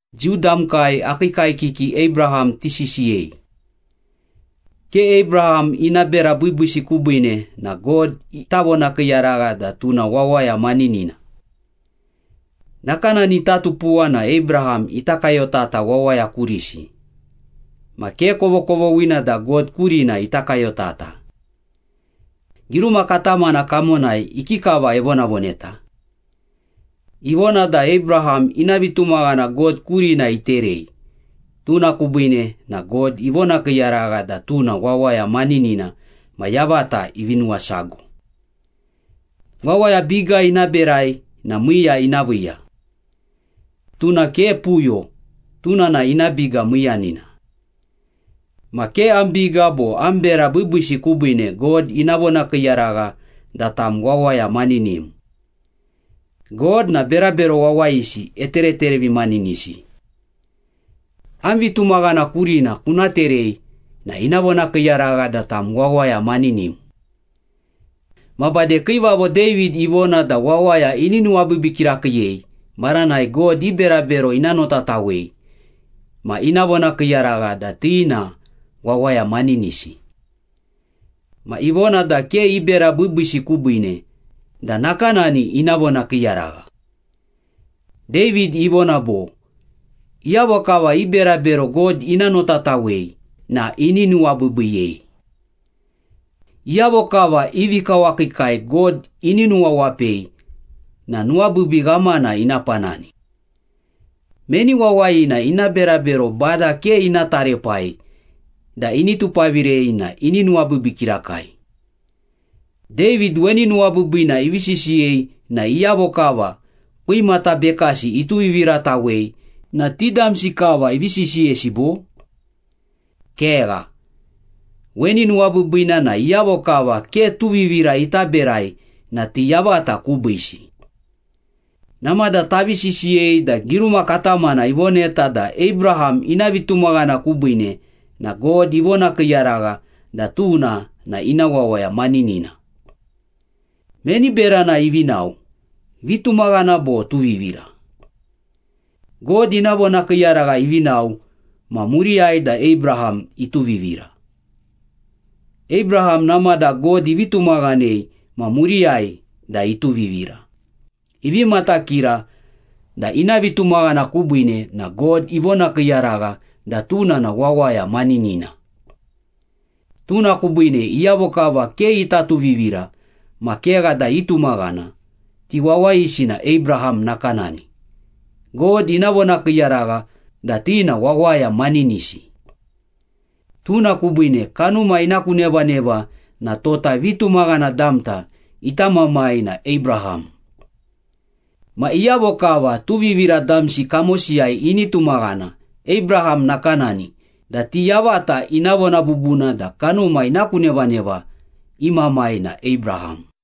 Jiu damkai akii kaekiki Abraham tisisiyei. Ke Abraham ina bera biibiisi kubiine na God ita vonakiiyaragha da tuna wawaya maninina. Nakanani ita tupuwa na Abraham ita kayotata wawaya kurisi, ma ke kovokovoghina da God kurina ita kayotata. Giruma katamana kamonai ikikava evonavoneta? Ivona da Abraham ina vitumaghana God kurina iterei, tuna kubiine na God ivonakiiyaragha da tuna wawaya maninina ma yavata ivi nuwasago. Wawaya biga ina berai na miiya ina viiya. Tuna ke puyo, tuna na ina biga miiyanina. Ma ke am biga bo am bera biibiisi kubiine God ina vonakiiyaragha da tam wawaya maninim. God na berabero wawayisi etereterevimaninisi. Am vitumaghana kurina kuna terei na ina vonakiiyaragha da tam wawaya maninim. Ma bade Kiivavo David ivona da wawaya ini nuwabiibii kirakiiyei maranai God i berabero ina notatawei ma ina vonakiiyaragha da ti na wawaya maninisi. Ma ivona da ke i bera biibiisi kubiine da nakanani ina vonakiiyaragha. David ivona bo, “Iyavo kava i berabero God ina notatawei na ini nuwabiibiiyei. Iyavo kava i vikawakiikai God ini nuwawapei na nuwabiibii ghamana ina panani. Meni wawayina ina berabero Bada ke ina taraepai da ini tupavirei na ini nuwabiibii kirakai.” David weni nuwabiibiina ivi sisiyei na iyavo kava kwimata bekasi ituviviratawei na ti damsi kava ivi sisiyesi bo? Kegha. Weni nuwabiibiina na iyavo kava ke tuvivira ita berai na ti yavata kubiisi. Namada tavi sisiyei da giruma katamana ivoneta da Abraham ina vitumaghana kubiine na God ivonakiiyaragha da tuna na ina wawaya maninina. Meni berana ivi nao, vitumaghana bo tuvivira? God ina vonakiiyaragha ivi nao ma muriyai da Abraham ituvivira. Abraham namada God ivi tumaghanei ma muriyai da ituvivira, ivi matakira da ina vitumaghana kubiine na God ivonakiiyaragha da tuna na wawaya maninina. Tuna kubiine iyavo kava ke ita tuvivira ma kegha da itumaghana, ti wawayisi na Abraham nakanani, God ina vonakiiyaragha da ti na wawaya maninisi. Tuna kubiine kanuma ina ku nevaneva na tota vitumaghana damta ita mamai na Abraham. Ma iyavo kava tuvivira damsi kamosiyai ini tumaghana Abraham nakanani na ti yavata ina vona bubuna da kanuma ina ku nevaneva i mamai na Abraham.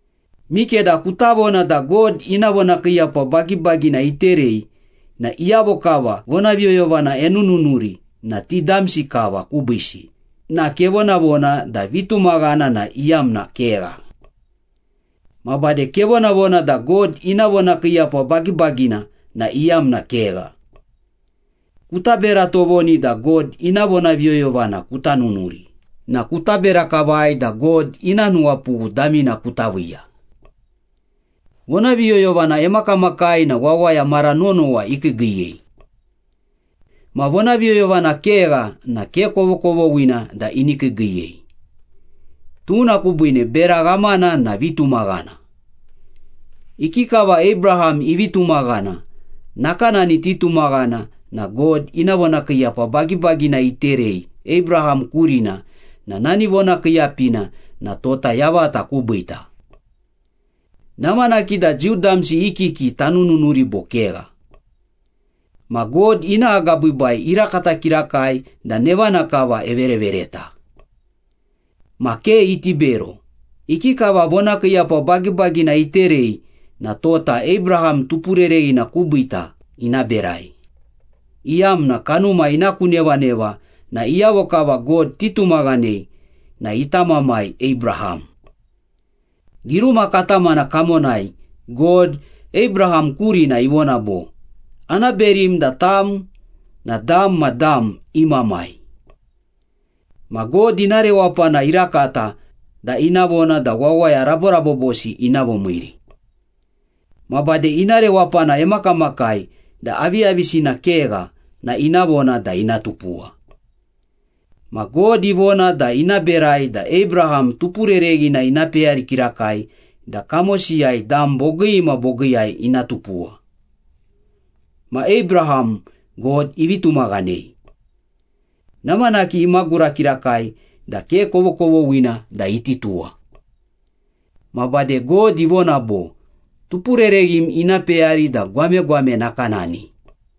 Mikeda kuta vona da God ina vonakiiyapa bagibagina iterei na iyavo kava vonaviyoyovana enununuri na ti damsi kava kubiisi na kevonavona da vitumaghana na iyamna kegha. Ma bade kevonavona da God ina vonakiiyapa bagibagina na iyamna kegha. Kuta bera tovoni da God ina vonaviyoyovana kuta nunuri na kuta bera kavai da God ina nuwapughu damina kuta viiya. Vonaviyoyovana emakamakai na wawaya mara nonowa ikiigiiyei. Ma vonaviyoyovana kegha na ke kovokovoghina da ini kiigiiyei. Tuna kubiine bera ghamana na vitumaghana. Ikikava Abraham ivi tumaghana, nakanani titumaghana na God ina vonakiiyapa bagibagina iterei Abraham kurina na nani vonakiiyapina na tota yavata kubiita. Namanaki da Jiu damsi i kiki tanununuri bo kegha. Ma God ina agabiibai irakata kirakai da nevana kava everevereta. Ma ke iti bero, ikikava vonakiiyapa bagibagina iterei na tota Abraham tupurereghina kubiita ina berai, iyamna kanuma ina ku nevaneva na iyavo kava God titumaghanei na ita mamai Abraham. Giruma katamana kamonai God, Abraham kurina ivona bo, “Ana berim da tam na dam ma dam i mamai.” Ma God ina rewapana irakata da ina vona da wawaya raborabobosi ina vomiiri. Ma bade ina rewapana emakamakai da aviyavisina kegha na ina vona da ina tupuwa. Ma God ivona da ina berai da Abraham tupurereghina ina peyari kirakai da kamosiyai dam bogii ma bogiiyai ina tupuwa. Ma Abraham, God ivi tumaghanei. Namanaki imagura kirakai da ke kovokovoghina da iti tuwa. Ma bade God ivona bo, “Tupurereghim ina peyari da gwamegwame nakanani.”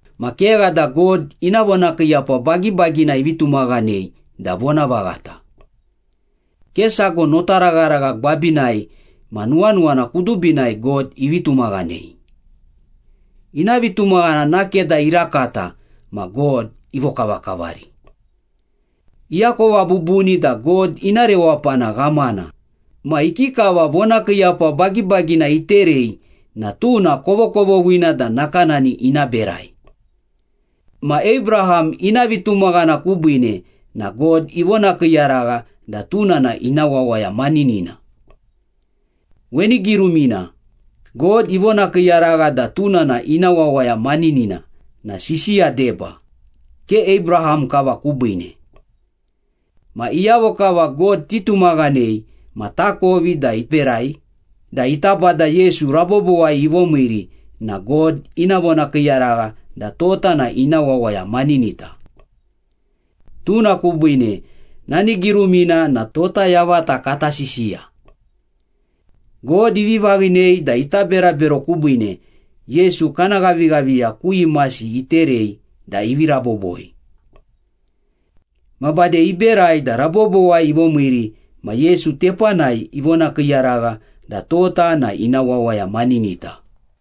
Ma kegha da God ina vonakiiyapa bagibagina ivi tumaghanei da vonavaghata. Ke sago notaragharagha gwabinai ma nuwanuwana kudubinai God ivi tumaghanei. Ina vitumaghana nake da irakata ma God ivokavakavari. Iakova bubuni da God ina rewapana ghamana, ma ikikava vonakiiyapa bagibagina iterei na tuna kovokovoghina da nakanani ina berai. Ma Abraham ina vitumaghana kubiine na God ivonakiiyaragha da tuna na ina wawaya maninina. Weni girumina, “God ivonakiiyaragha da tuna na ina wawaya maninina” na sisiya deba, ke Abraham kava kubiine. Ma iyavo kava God titumaghanei ma takovi da iberai da ita Bada Yesu rabobowai ivomiiri na God ina vonakiiyaragha da tota na ina wawaya maninita. Tuna kubiine nani girumina na tota yavata kati sisiya. God ivi vaghinei da ita berabero kubiine Yesu kana ghavighaviya ku imasi iterei da ivi raboboi. Ma bade iberai da rabobowai ivomiiri ma Yesu tepanai ivonakiiyaragha da tota na ina wawaya maninita.